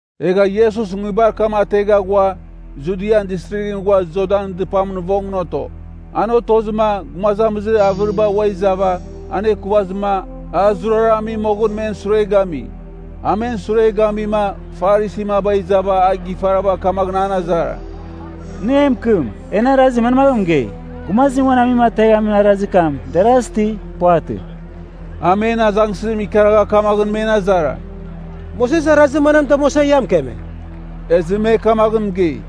Egha Iesus nguibar kam ategha ghua, Judian Distrighɨn ghua Jordanɨn dɨpamɨn vongɨn oto. An otozɨma, gumazamizir avɨriba ua izava, anekuvazɨma, a zurara ami moghɨn men sure gami. A men sure gamima, Farisin maba izava a gifarava kamaghɨn an azara, “Nɨ e mɨkɨm, en arazim manmaghɨn mɨgei? Gumazim uan amuim ateghamin arazir kam deras, ti puvatɨ?” A men azangsɨzim ikaragha kamaghɨn men azara, “Moses arazir manam damuasa ia mɨkeme?” Ezɨ me kamaghɨn mɨgei,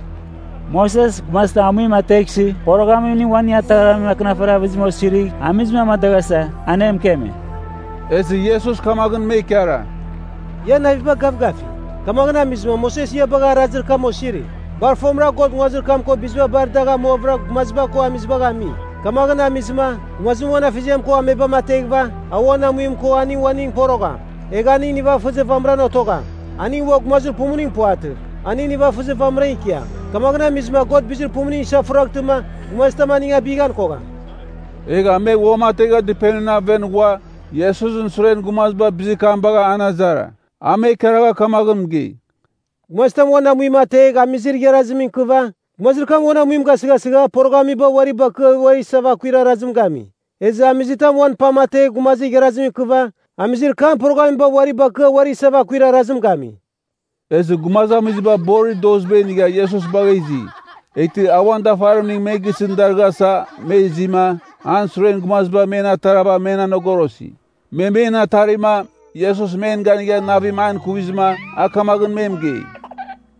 “Moses, gumazitam amuim ateghsɨ poroghamning uaning ataghraghamin akɨnafarir avɨzim osirigh amizim amadaghasa, an e mɨkeme.” Ezɨ Iesus kamaghɨn me ikara, “Ian naviba gavgafi, kamaghɨn amizɨma Moses ia bagha arazir kam osiri. Bar fomɨra God nguazir kam ko biziba bar dagh amuavɨra gumaziba ko amizibagh ami. Kamaghɨn amizɨma, gumazim uan afeziam ko amebam ateghɨva, a uan amuim ko aning uaningɨn porogham. Egh aning nivafɨzir vamɨram otogham. Aning ua gumazir pumuning puvatɨ. Aning nivafɨzir vamɨra ikiam Kamaghɨn amizɨma God bizir pumuning isafuraghtɨma, gumazitam aning abighan kogham.” Egha me uamategha dɨpenimɨn aven ghua, Iesusɨn suren gumaziba bizir kam bagha an azara. A me ikaragha kamaghɨn mɨgei, “Gumazitam uan amuim ategh amizir igharazimɨn ikɨva, gumazir kam uan amuim gasɨghasɨgha poroghamiba uari bakɨa uari isava akuir arazim gami. Ezɨ amizitam uan pam ategh gumazir igharazimɨn ikɨva, amizir kam poroghamiba uari bakɨa uari isava akuir arazim gami.” Ezɨ gumazamiziba borir doziba inigha Iesus bagha izi. Eghtɨ a uan dafarimning me gisɨn darɨghasa me izima, an suren gumaziba men atarava men anogorosi. Me men atarima, Iesus men ganigha navim an ikuvizɨma, a kamaghɨn me mɨgei,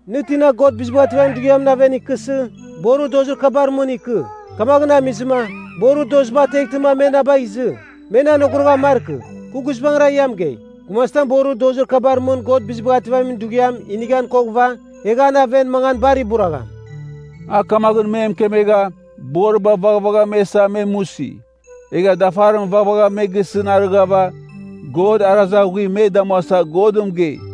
“Nɨ tina God Bizibagh Ativamin Dughiamɨn aven ikɨsɨ, borir dozir kabar mɨn ikɨ. Kamaghɨn amizɨma borir doziba ateghtɨma, me na bagh izɨ. Men anogoroghan markɨ. Kɨ guizbangɨra ia mɨgei, gumazitam borir dozir kabar mɨn God Bizibagh Ativamin Dughiam inighan koghɨva, egh an aven mangan bar iburagham.” A kamaghɨn me mɨkemegha, boriba vaghvagha me isa me musi. Egha dafarim vaghvagha me gisɨn arɨghava, God arazir aghuim me damuasa Godɨn mɨgei.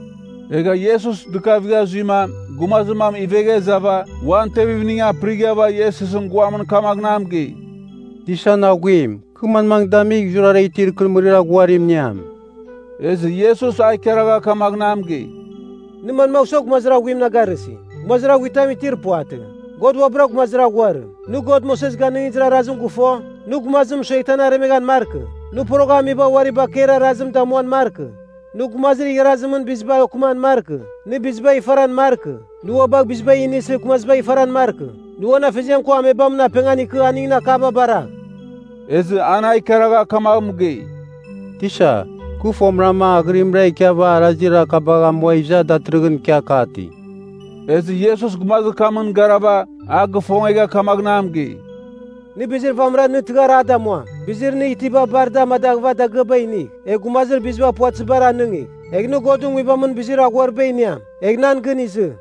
Egha Iesus dɨkavigha zuima, gumazir mam ivegha izava, uan tevimning apɨrighava Iesusɨn guamɨn kamaghɨn a mɨgei, “Tisan Aghuim, kɨ manmaghɨn damigh zurara itir ikɨrɨmɨrir aghuarim iniam?” Ezɨ Iesus a ikaragha kamaghɨn a mɨgei, “Nɨ manmagh sua gumazir aghuim na garɨsi? Gumazir aghuitam itir puvatɨ. God uabɨra gumazir aghuarim. Nɨ God Moses ganɨngizir arazim gɨfo, ‘Nɨ gumazim mɨsueghtɨ an aremeghan markɨ, nɨ poroghamiba uari bakeir arazim damuam markɨ, nɨ gumazir igharazimɨn biziba okɨman markɨ, nɨ bizibagh ifaran markɨ, nɨ ua bagh biziba inisɨ gumazibagh ifaran markɨ, nɨ uan afeziam ko amebamɨn apengan ikɨ aningɨn akaba baragh.’” Ezɨ an a ikaragha kamagh mɨgei, “Tisa, kɨ fomɨram aghɨrimra ikiava arazir kabagh amua iza datɨrɨghɨn ikia kati.” Ezɨ Iesus gumazir kamɨn garava, a gifongegha kamaghɨn a mɨgei, “Nɨ bizir vamɨra nɨ tɨghar a damuam. Bizir nɨ itiba bar da amadaghɨva dagɨaba inigh, egh gumazir biziba puvatɨzibar anɨngigh. Egh nɨ Godɨn Nguibamɨn bizir aghuariba iniam. Egh, nan gɨn izɨ.”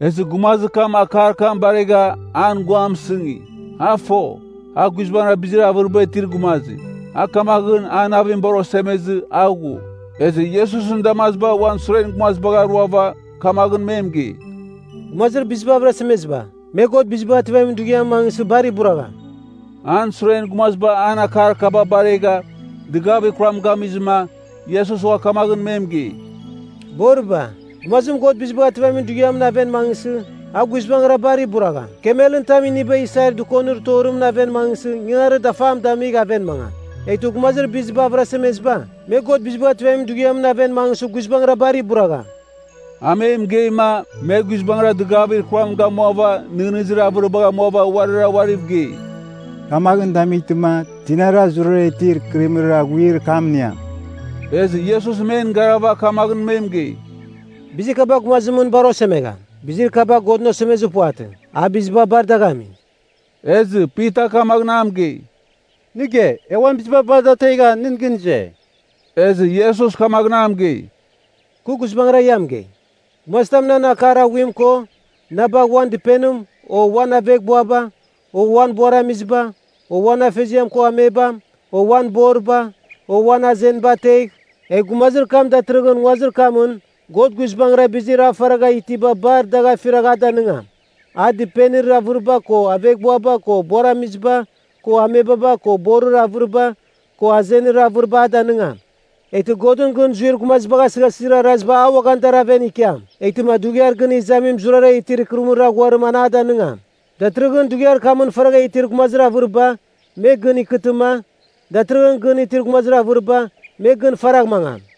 Ezɨ gumazir kam akar kam baregha, an guam mɨsɨngi. A fo, a guizbangɨra bizir avɨriba itir gumazim. A kamaghɨn, an navim bar osemezɨ a ghu. Ezɨ Iesusɨn damaziba uan suren gumazibagh aruava, kamaghɨn me mɨgei, “Gumazir biziba avɨrasemeziba, me God Bizibagh Ativamin Dughiamɨn mangɨsɨ bar iburagham!” An suren gumaziba an akar kaba baregha, dɨgavir kuram gamizɨma, Iesus ua kamaghɨn me mɨgei, “Boriba, gumazim God Bizibagh Ativamin Dughiamɨn aven mangɨsɨ, a guizbangɨra bar iburagham. Kamelɨn tam iniba isair dɨkonir torimɨn aven mangɨsɨ ingangarir dafam damigh aven mangam. Eghtɨ gumazir biziba avɨrasemeziba, me God Bizibagh Ativamin Dughiamɨn aven mangɨsɨ guizbangɨra bar iburagham!” A me mɨgeima, me guizbangɨra dɨgavir kuram gamuava nɨghnɨzir avɨribagh amuava uarira uariv gei, “Kamaghɨn damightɨma, tinara zurara itir ikɨrɨmɨrir aghuir kam iniam?” Ezɨ Iesus men garava kamaghɨn me mɨgei, “Bizir kaba gumazimɨn bar osemegham. Bizir kaba Godɨn osemezir puvatɨ. A biziba bar dagh ami.” Ezɨ Pita kamaghɨn a mɨgei, “Nɨ ge, e uan biziba bar da ategha, nɨn gɨn ize.” Ezɨ Iesus kamaghɨn me mɨgei, “Kɨ guizbangɨra ia mɨgei, gumazitam nan akar aghuim ko na bagh, uan dɨpenim, o uan aveghbuaba, o uan buaramiziba, o uan afeziam ko amebam, o uan boriba, o uan azeniba ategh, egh gumazir kam datɨrɨghɨn nguazir kamɨn God guizbangɨra bizir a faragha itiba bar dagh afiragh a danɨngam. A dɨpenir avɨriba ko aveghbuaba ko buaramiziba ko amebaba ko borir avɨriba, ko azenir avɨriba a danɨngam. Eghtɨ Godɨn gɨn zuir gumazibagh asɨghasɨzir araziba a uaghan dar aven ikiam. Eghtɨma dughiar gɨn izamim zurara itir ikɨrɨmɨrir aghuarim an a danɨngam. Datɨrɨghɨn dughiar kamɨn faragha itir gumazir avɨriba, me gɨn ikɨtɨma, datɨrɨghɨn gɨn itir gumazir avɨriba, me gɨn faragh mangam.”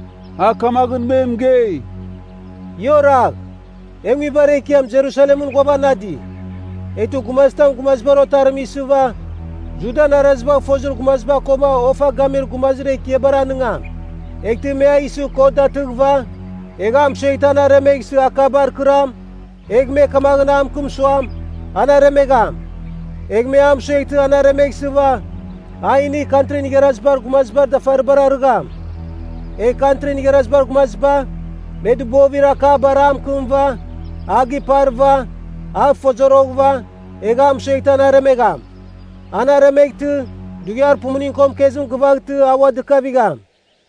A kamaghɨn me mɨgei, “Ia oragh. E nguibar ekiam Jerusalemɨn ghuavanadi. Eghtɨ gumazitam Gumazibar Otarim isɨva, Judan arazibagh fozir gumaziba koma ofa gamir gumazir ekiabar anɨngam. Eghtɨ me a isɨ kot datɨghɨva, egh a mɨsueghtɨ an aremeghsɨva akabar akɨram, egh me kamaghɨn a mɨkɨm suam, An aremegham. Egh me a mɨsueghtɨ an aremeghsɨva, a inigh Kantrin Igharazibar Gumazibar dafaribar arɨgham. Egh Kantrin Igharazibar Gumaziba, me dɨbovir akabar a mɨkɨmɨva, a giparɨva, a fozoroghɨva, egh a mɨsueghtɨ an aremegham. An aremeghtɨ, dughiar pumuning ko mɨkezim gɨvaghtɨ a ua dɨkavigham.”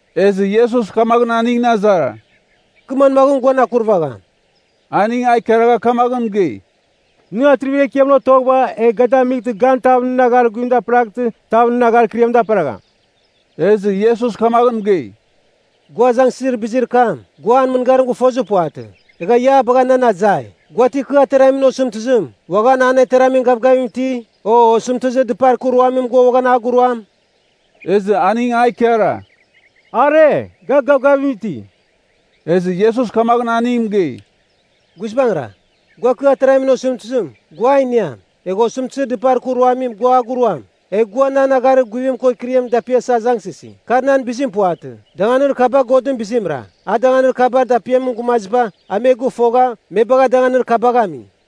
Ezɨ Iesus kamaghɨn aningɨn azara, “Kɨ manmaghɨn guan akurvagham?” Aning a ikaragha kamaghɨn mɨgei, “Nɨ atrivir ekiamɨn otoghɨva egh ga damightɨ gan tav nɨn agharir guvim daperaghtɨ, tav nɨn agharir kɨriam daperagham.” Ezɨ Iesus kamaghɨn mɨgei, “Gua azangsɨzir bizir kam, gua an mɨngarim gɨfozir puvatɨ, egha ia a bagha nan azai. Gua ti kɨ ateramin osɨmtɨzim, uaghan an ateramin gavgavim iti? O osɨmtɨzir dɨpar kɨ ruamim gua uaghan a guruam?” Ezɨ aning a ikara, “Are, ga gavgavim iti.” Ezɨ Iesus kamaghɨn aning mɨgei, “Guizbangɨra, gua kɨ ateramin osɨmtɨzim, gua a iniam, egh osɨmtɨzir dɨpar kɨ ruamim gua a guruam. Egha gua nan agharir guvim ko kɨriam dapiasa azangsɨsi, kar nan bizim puvatɨ. Danganir kaba Godɨn bizimra. A danganir kabar dapiamin gumaziba, a me gɨfogha, me bagha danganir kabagh ami.”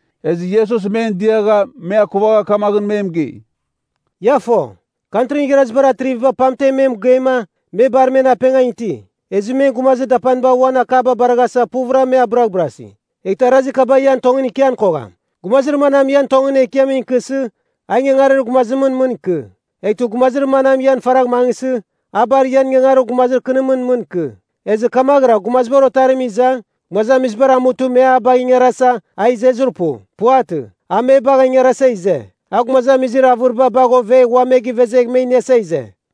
Ezɨ Iesus men diagha, me akuvagha kamaghɨn me mɨgei, “Ia fo, Kantrin Igharazibar atriviba pamten me gamima, me bar men apengan iti. Ezɨ men gumazir dapaniba uan akaba baraghasa puvɨra me abɨraghbɨrasi. Eghtɨ arazir kaba ian tongɨn ikian kogham. Gumazir manam ian tongɨn ekiamɨn ikɨsɨ, a ingangarir gumazimɨn mɨn ikɨ. Eghtɨ gumazir manam ian faragh mangɨsɨ, a bar ian ingangarir gumazir kɨnimɨn mɨn ikɨ. Ezɨ kamaghɨra Gumazibar Otarim iza, gumazamizibar amutɨ me a bagh ingarasa, a izezir pu. Puvatɨ, a me bagh ingarasa ize. A gumazamizir avɨriba bagh ovegh ua me givezegh me iniasa ize.”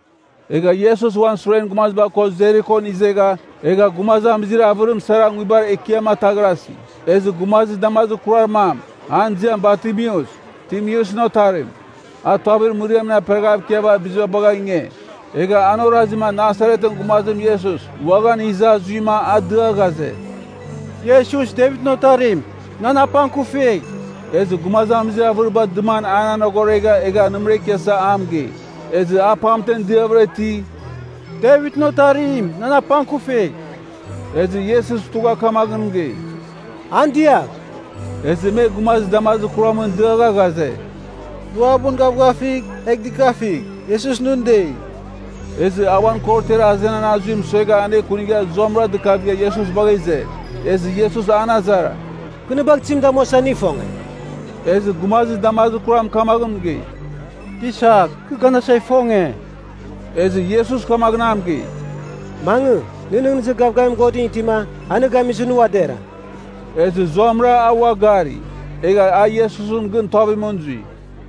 Egha Iesus uan suren gumaziba ko Jerikon izegha, egha gumazamizir avɨrim sara nguibar ekiam ataghrasi. Ezɨ gumazir damazir kurar mam, an ziam Bartimeus (Timeusɨn otarim), a tuavir mɨriamɨn aperaghav ikiava biziba bagha inge. Egha an orazima Nasaretɨn gumazim Iesus uaghan iza zuima a dia ghaze, “Iesus Devitɨn Otarim, nan apangkufigh!” Ezɨ gumazamizir avɨriba dɨman an anogoregha egha nɨmɨra ikiasava a mɨgei. Ezɨ a pamtem diavɨra iti, “Devitɨn Otarim nan apangkufigh!” Ezɨ Iesus tugha kamaghɨn mɨgei, “An diagh.” Ezɨ me gumazir damazir kuramɨn diagha ghaze, “Nɨ uabɨn gavgafigh, egh dɨkafigh! Iesus nɨn dei.” Ezɨ a uan korotiar azenan azuim suegha anekunigha zuamɨra dɨkavigha Iesus bagha ize. Ezɨ Iesus an azara, “Kɨ nɨ bagh tizim damuasa nɨ ifonge?” Ezɨ gumazir damazir kuram kamaghɨn mɨgei, “Tisa, kɨ ganasa ifonge.” Ezɨ Iesus kamaghɨn a mɨgei, “Mangɨ. Nɨ nɨghnɨzir gavgavim Godɨn itima, a nɨ gamizɨ nɨ ua dera.” Ezɨ zuamɨra a ua gari. Egha a Iesusɨn gɨn tuavimɨn zui.